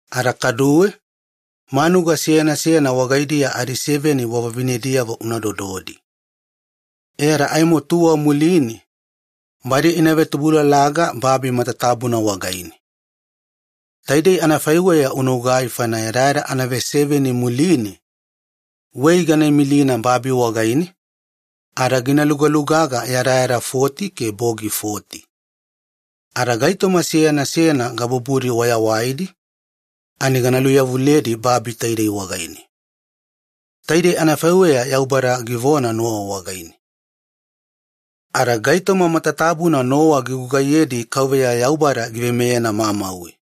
Ada kaduwe manuga seyana seyana wagaidiya adiseveni wavavinediyavo una dododi. E ada aimo badi ina vetubulalaga babi matatabuna wagaine tuwa muline. Taidei anafaiweya unagugai faina yadayada anaveseveni muline wei gana imilina babi wagaine ada gina lugalugaga yadayada foti ke bogi foti. Ada gaitoma seyana seyana gabubudi wayawaidi gana luveyawaliyedi babi taidei wagaine.” Taidei anafaiweya Yaubada givona Nowa wagaine. Ada gaitoma matatabuna Nowa gigugaiyedi Yaubada giveimeyena mamauwe.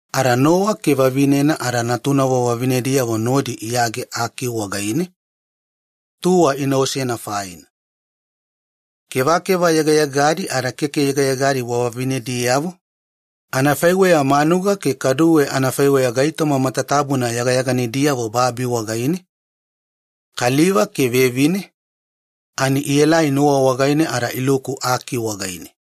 Ada Nowa ke vavinena ada natunavo vavinediyavo nodi iyage aki wagaine, tuwa inaosena. Kevakeva yegayegadi ada keke yegayegadi wavavinediyavo, anafaiweya manuga ke kaduwe anafaiweya gaitoma matatabuna yagayaganidiyavo babi wagaine, kaliva ke vevine ielai Nowa wagaine ada iluku aki wagaine,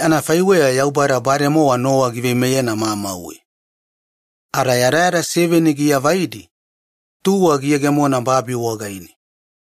anafaiweya Yaubada bademowa Nowa giveimeyena mamauwe. Ada yadayada seveni giavaidi muline, tuwa giyegemona babi wagaine.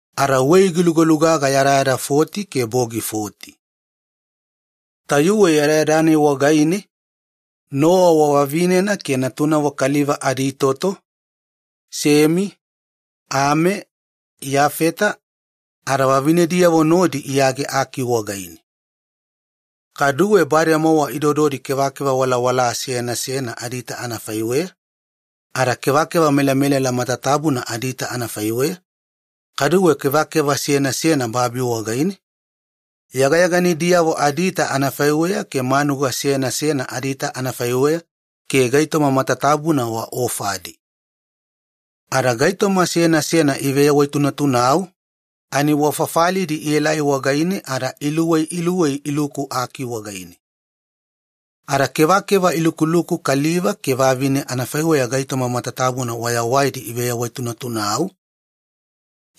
Ada wei gilugalugaga yadayada foti ke bogi foti. Tayuwe yadayada-nai wagaine Nowa wavavinena ke natunavo kaliva aditoto, Semi, Ami ke Iyafeta ada vavinediyavo nodi iyage aki wagaine. Kaduwe bademowa idododi kevakeva walawala seyana seyana adiita anafaiweya, ada kevakeva melamelala matatabuna adiita anafaiweya, kaduwe kevakeva seyana seyana babi wagaine, yagayaganidiyavo adiita anafaiweya ke manuga seyana seyana adiita anafaiweya ke gaitoma matatabuna waofadi. Ada gaitoma seyana seyana iveyawaitunatunau ani wafafalidi ielai wagaine ada luwei luwei iluku aki wagaine. Ada kevakeva ilukuluku kaliva ke vavine anafaiweya gaitoma matatabuna wayawaidi iveyawaitunatunau,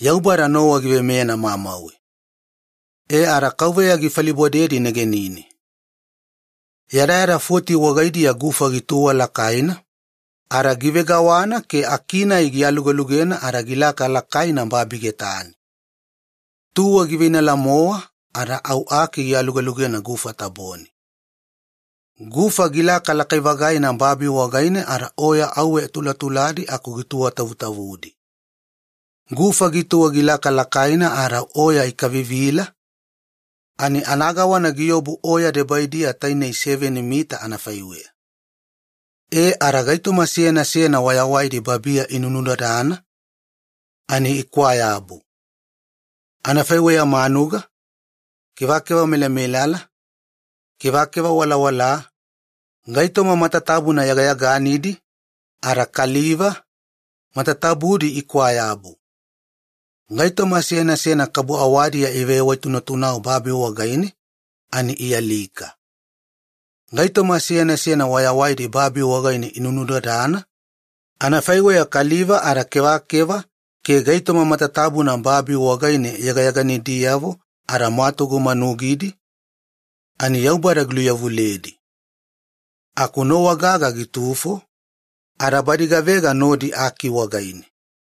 Yaubada Nowa giveimeyena mamauwe. E ada Yaubada gifalibodedi negenine. Yadayada foti wagaidiya gufa gituwa lakaina ada givegawana ke aki-nai gialualugena ada gilaka lakaina babi getane. Tuwa giveinala-mowa ada au aki gialugelugena gufa tabone. Gufa gilaka lakai-vagaina babi wagaine ada oya auwe tulatuladi aku gituwatavutavudi. Gufa gituwa gilaka lakaina ada au oya ikavivila ani anagawana giobu oya debaidiya tainei seveni mita anafaiweya. E ada gaitoma seyana seyana wayawaidi babiya inunudadana ikwaa-yabu, anafaiweya manuga, kevakeva melamelala, kevakeva walawalaa, gaitoma matatabuna yagayaganidi, ada kaliva, matatabudi ikwayabu. Gaitoma seyana seyana kabu awadiya iveyawaitunatunau babi wagaine ani ialika. Gaitoma seyana seyana wayawaidi babi wagaine inunudadana, anafaiweya kaliva ada kevakeva ke gaitoma matatabuna babi wagaine yagayaganidiyavo ada mwatugu manugidi ani Yaubada giluveyawaliyedi. Aku Nowa gaga gitufo, ada badi gavega nodi aki wagaine.